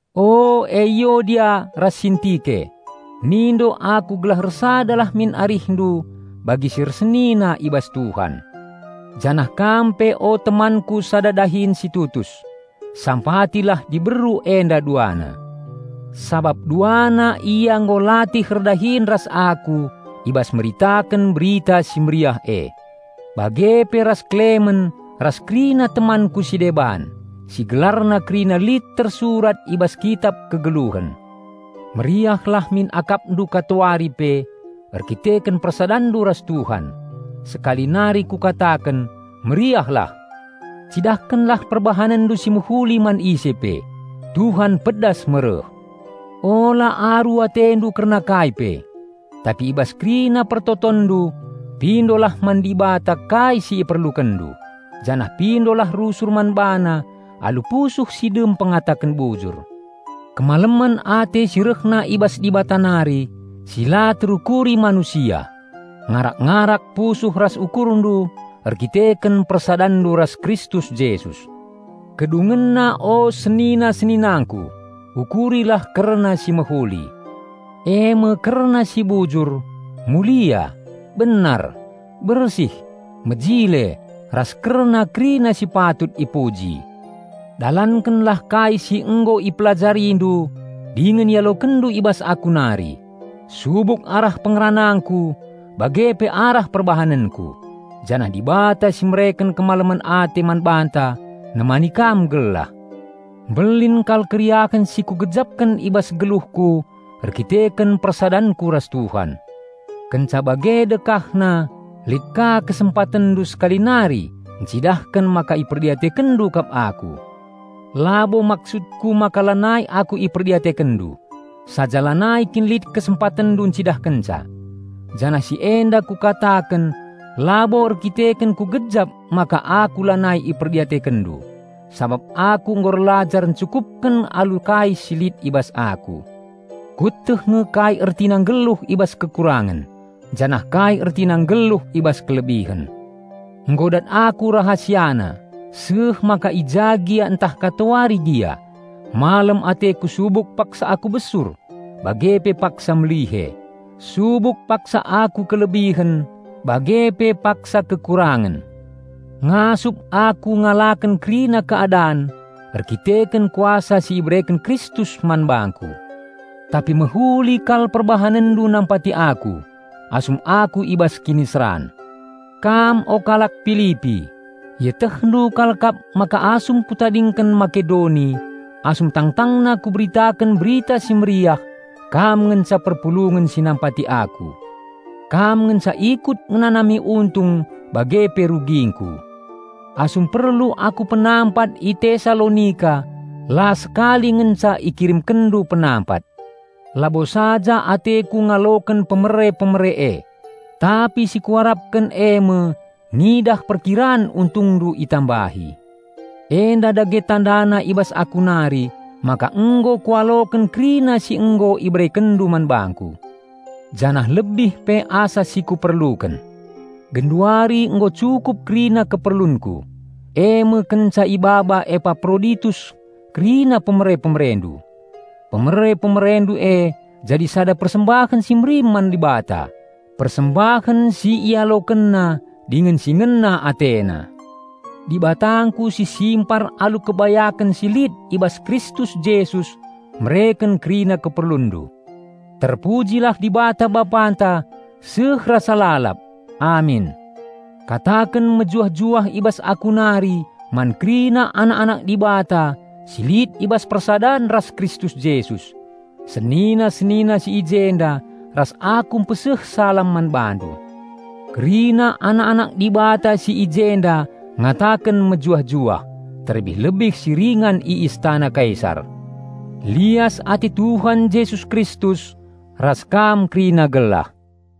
O Eiodia ras Sintike, mindo aku gelah ersadalah min arihndu bagi si ersenina i bas Tuhan. Janah kam pe o temanku sada dahin si tutus, sampatilah diberu enda duana. Sabap duana ia nggo latih erdahin ras aku i bas meritaken Berita Si Mehuli e bage pe ras Klemen ras kerina temanku si deban, si gelarna kerina lit i bas Kitap Dibata ingan nuratken gelar-gelar kalak si nggeluh. Meriahlah min akapndu katawari pe erkiteken persadanndu ras Tuhan. Sekali nari kukataken: Meriahlah! Cidahkenlah perbahanenndu si mehuli man ise pe. Tuhan pedas me reh. Ula aru atendu kerna kai pe, tapi i bas kerina pertotonndu, pindolah man Dibata kai si iperlukenndu, janah pindolah rusur man BaNa alu pusuh si dem pengataken bujur. Kemalemen ate si rehna i bas Dibata nari, si la terukuri manusia, ngarak-ngarak pusuh ras ukurndu erdandanken persadanndu ras Kristus Jesus. Kedungenna o senina-seninangku, ukurilah kerna si mehuli, eme kerna si bujur, mulia, benar, bersih, mejile ras kerna kerina si patut ipuji. Dalankenlah kai si nggo ipelajarindu dingen ialokenndu i bas aku nari, subuk arah pengeranangku bage pe arah perbahanenku. Janah Dibata si mereken kemalemen ate man banta nemani kam gelah. Mbelin kal keriahen si kugejapken i bas geluhku erkiteken persadanku ras Tuhan. Kenca bage dekahna, lit ka kesempatenndu sekali nari ncidahken maka iperdiatekenndu kap aku. Labo maksudku maka lanai aku iperdiatekenndu, saja lanai kin lit kesempatenndu ncidahkenca. Janah si enda kukataken labo erdandanken kugejap maka aku lanai iperdiatekenndu; sabap aku nggo erlajar encukupken alu kai si lit i bas aku. Kueteh nge kai ertina nggeluh i bas kekurangen, janah kai ertina nggeluh i bas kelebihen. Nggo kudat rahasiana, seh maka i ja gia ntah katawari gia, malem ateku subuk paksa aku besur bage pe paksa melihe, subuk paksa aku kelebihen bage pe paksa kekurangen. Ngasup aku ngalaken kerina keadan erdandanken kuasa si ibereken Kristus man bangku. Tapi mehuli kal perbahanenndu nampati aku, asum aku i bas kiniseran. Kam o kalak Pilipi, ietehndu kal kap maka asum kutadingken Makedoni, asum tangtangna kuberitaken Berita Si Mehuli kam ngenca perpulungen si nampati aku. Kam ngenca ikut ngenanami untung bage pe rugingku. Asum perlu aku penampat i Tesalonika la sekali ngenca ikiremkenndu penampat. Labo saja ateku ngaloken pemere-pemere e, tapi si kuarapken eme ngidah perkiran untungndu itambahi. Enda dage tandana i bas aku nari maka nggo kualoken kerina si nggo iberekenndu man bangku. Janah lebih pe asa si kuperluken. Genduari nggo cukup kerina keperlunku, eme kenca ibaba Epaproditus kerina pemere-pemerendu. Pemere-pemerendu e jadi sada persembahen si merim man Dibata, persembahen si IalokenNa dingen si ngena AteNa. Dibatangku si simpar alu kebayaken si lit i bas Kristus Jesus mereken kerina keperlunndu. Terpujilah Dibata Bapanta seh rasa lalap! Amin. Kataken mejuah-juah i bas aku nari man kerina anak-anak Dibata si lit i bas persadan ras Kristus Jesus. Senina-senina si i jenda ras aku mpeseh salam man bandu. Kerina anak-anak Dibata si i jenda ngataken mejuah-juah, terlebih-lebih si ringan i istana Kaisar. Lias ate Tuhan Jesus Kristus ras kam kerina gelah.